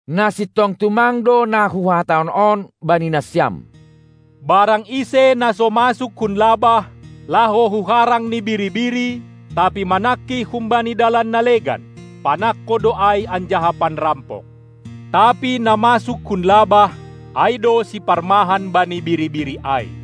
Na sintong tumang do na Huhatahon on bani nasiam: Barang ise, na so masuk hun labah, laho hu harang ni biri-biri, tapi manangkih humbani dalan na legan, panangko do ai anjaha panrampok. Tapi na masuk hun labah, ai do siparmahan bani biri-biri ai.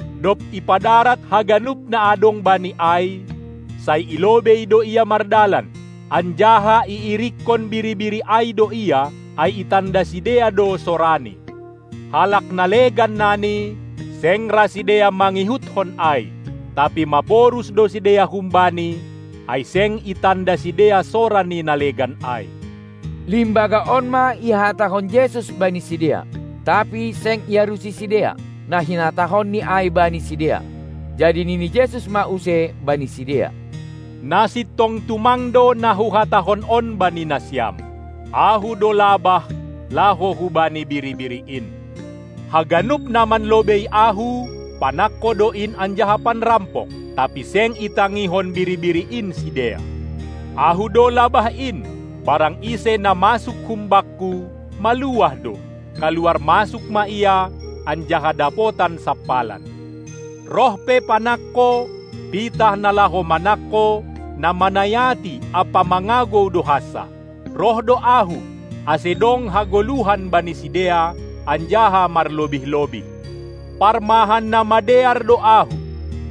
Dob ipadarat haganup na adong bani ai, sai i lobei do ia mardalan, anjaha iirikkon biri-biri ai do ia, ai itanda sidea do sorani. Halak na legan nani, seng ra sidea mangihutkon ai, tapi maporus do sidea humbani, ai seng itanda sidea sora ni na legan ai. Limbaga on ma ihatahon Jesus bani sidea, tapi seng iarusi sidea, na hinatahonni ai bani sidea. Jadi nini Jesus ma use bani sidea: Na sintong tumang do na Huhatahon on bani nasiam: Ahu do labah laho hubani biri-biri in. Haganup na manlobei Ahu panangko do in anjaha panrampok, tapi seng itangihon biri-biri in sidea. Ahu do labah in; barang ise na masuk hum Bakku, maluah do, kaluar masuk ma ia, anjaha dapotan sampalan. Roh pe panangko, pitah na laho manangko, na manayati ampa mangagou do hansa. Roh do Ahu, ase dong hagoluhan bani sidea, anjaha marlobih-lobih. Parmahan na madear do Ahu.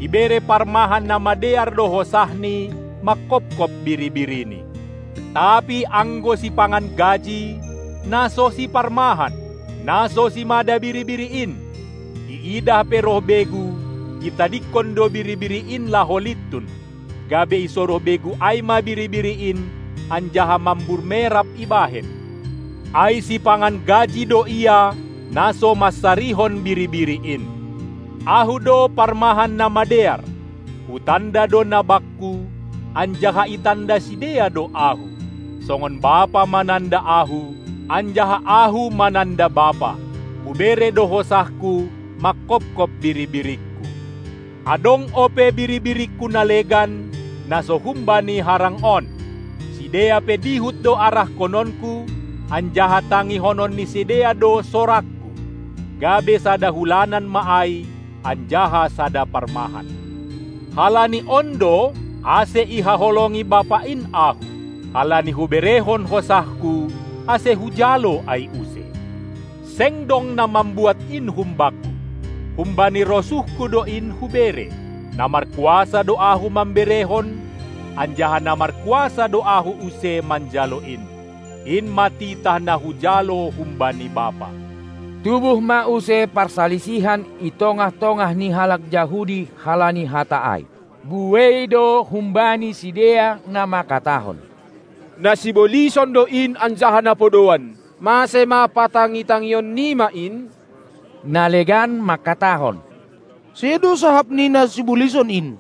Ibere parmahan na madear do hosahni mangkopkop biri-birini. Tapi anggo sipangan gaji, na so siparmahan, na so simada biri-biri in, iidah pe roh begu, itadingkon do biri-biri in laho lintun, gabe isoroh begu ai ma biri-biri in anjaha mambur merap ibahen, ai sipangan gaji do ia, na so mansarihon biri-biri in. Ahu do parmahan na madear, Hutanda do na Bakku, anjaha itanda sidea do Ahu, songon Bapa mananda Ahu, anjaha Ahu mananda Bapa. Hubere do hosahKu mangkopkop biri-biringKu, Adong ope biri-biringKu na legan, na so humbani harang on. Sidea pe dihut do arahkononKu, anjaha tangihonon ni sidea do sorangKu, gabe sada hulanan ma ai anjaha sada parmahan. Halani on do, ase ihaholongi Bapa in Ahu, halani Huberehon hosahKu, ase Hujalo ai use. Seng dong na mambuat in hum-Bakku, humbani rosuhKu do in Hubere. Na markuasa do Ahu mamberehon, anjaha na markuasa do Ahu use manjalo in. In ma titah na Hujalo humbani Bapa. Tubuh ma use parsalisihan i tongah-tongah ni halak Jahudi halani hata ai. Buei do humbani sidea na mangkatahon: Na sibolison do In anjaha na podouan! Mase ma patangi-tangion nima in? Na legan mangkatahon: Sedo sahap ni na sibolison in!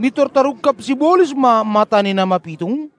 Mintor tarungkab sibolis ma mata ni na mapitung?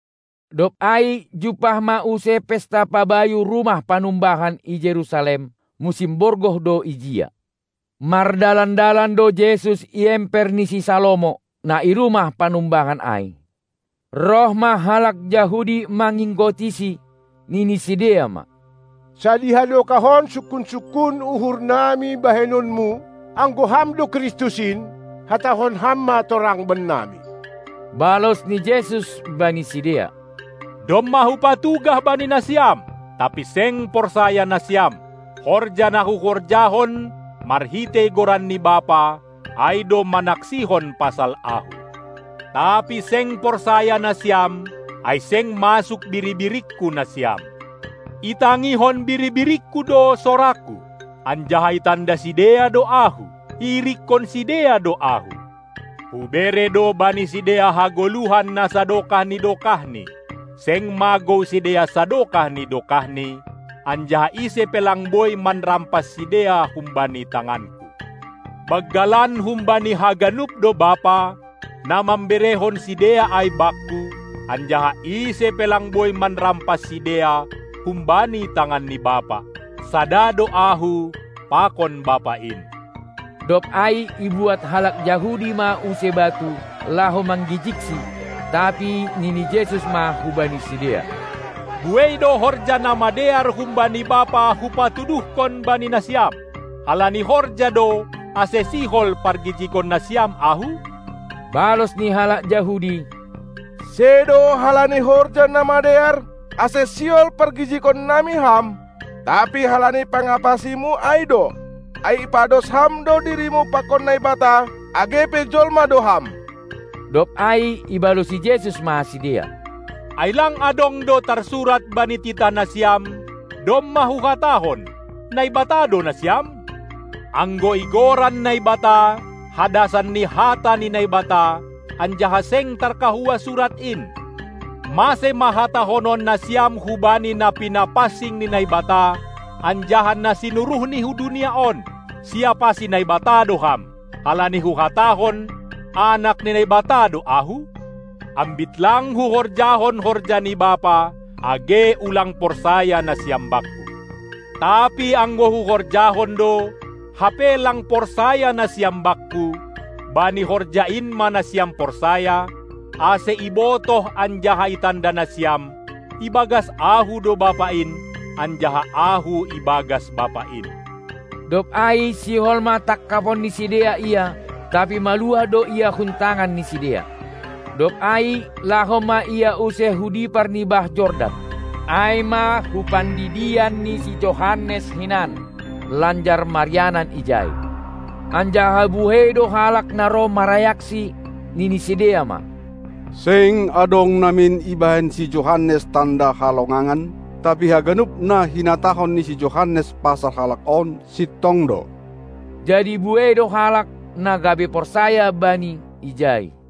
Dob ai jumpah ma use pesta pabayu rumah panumbahan i Jerusalem, musim borgoh do ijia. Mardalan-dalan do Jesus i emper ni si Salomo, na i rumah panumbahan ai. Roh ma halak Jahudi manginggotiSi, nini sidea ma: Sadiha dokah on sungkun-sungkun uhur nami bahenonMu? Anggo Ham do Kristus in, hatahon Ham ma torang bennami. Balos ni Jesus bani sidea: Domma Hupatugah bani nasiam, tapi seng porsaya nasiam. Horja na Huhorjahon marhitei goran ni Bapa, ai do manaksihon pasal Ahu. Tapi seng porsaya nasiam, ai seng masuk biri-biringKu nasiam. Itangihon biri-biringKu do soraKu, anjaha itanda sidea do Ahu, iirikkon sidea do Ahu. Hubere do bani sidea hagoluhan na sadokah ni dokahni; seng magou sidea sadokah ni dokahni, anjaha ise pe lang boi manrampas sidea humbani tanganKu. Banggalan humbani haganup do Bapa, na mamberehon sidea ai Bakku, anjaha ise pe lang boi manrampas sidea humbani tangan ni Bapa. Sada do Ahu pakon Bapa in. Dob ai ibuat halak Jahudi ma use batu, laho manggijigSi. Tapi nini Jesus ma hubani sidea: Buei do horja na madear humbani Bapa Hupatuduhkon bani nasiam. Halani horja do, ase sihol pargijigon nasiam Ahu? Balos ni halak Jahudi: Sedo halani horja na madear, ase sihol pargijigon nami Ham, tapi halani pangapasiMu ai do, ai ipados Ham do dirimu pakon Naibata, age pe jolma do Ham. Dob ai ibalosi Jesus ma sidea: Ai lang adong do tarsurat bani titah nasiam: Domma Huhatahon, Naibata do nasiam? Anggo igoran Naibata, hadasan ni hata ni Naibata, anjaha seng tarkahua Surat in, mase ma hatahonon nasiam hubani na pinapansing ni Naibata, anjaha na sinuruhNi hu dunia on: "Siapasi Naibata do Ham", halani Huhatahon: Anak ni Naibata do Ahu? Ambit lang Huhorjahon horja ni Bapa, age ulang porsaya nasiam Bakku. Tapi anggo Huhorjahon do, hape lang porsaya nasiam Bakku, bani horja in ma nasiam porsaya, ase ibotoh anjaha itanda nasiam, ibagas Ahu do Bapa in, anjaha Ahu ibagas Bapa in. Dob ai sihol ma tangkapon ni sidea Ia, tapi maluah do Ia hun tangan ni sidea. Dob ai laho ma Ia use hu dipar ni bah Jordan, ai ma hu pandidian ni si Johannes hinan, lanjar marianan ijai. Anjaha buei do halak na roh marayaksi, nini sidea ma: Seng adong namin ibahen si Johannes tanda halongangan, tapi haganup na hinatahon ni si Johannes pasal Halak on, sintong do. Jadi buei do halak, na gabe porsaya Bani ijai.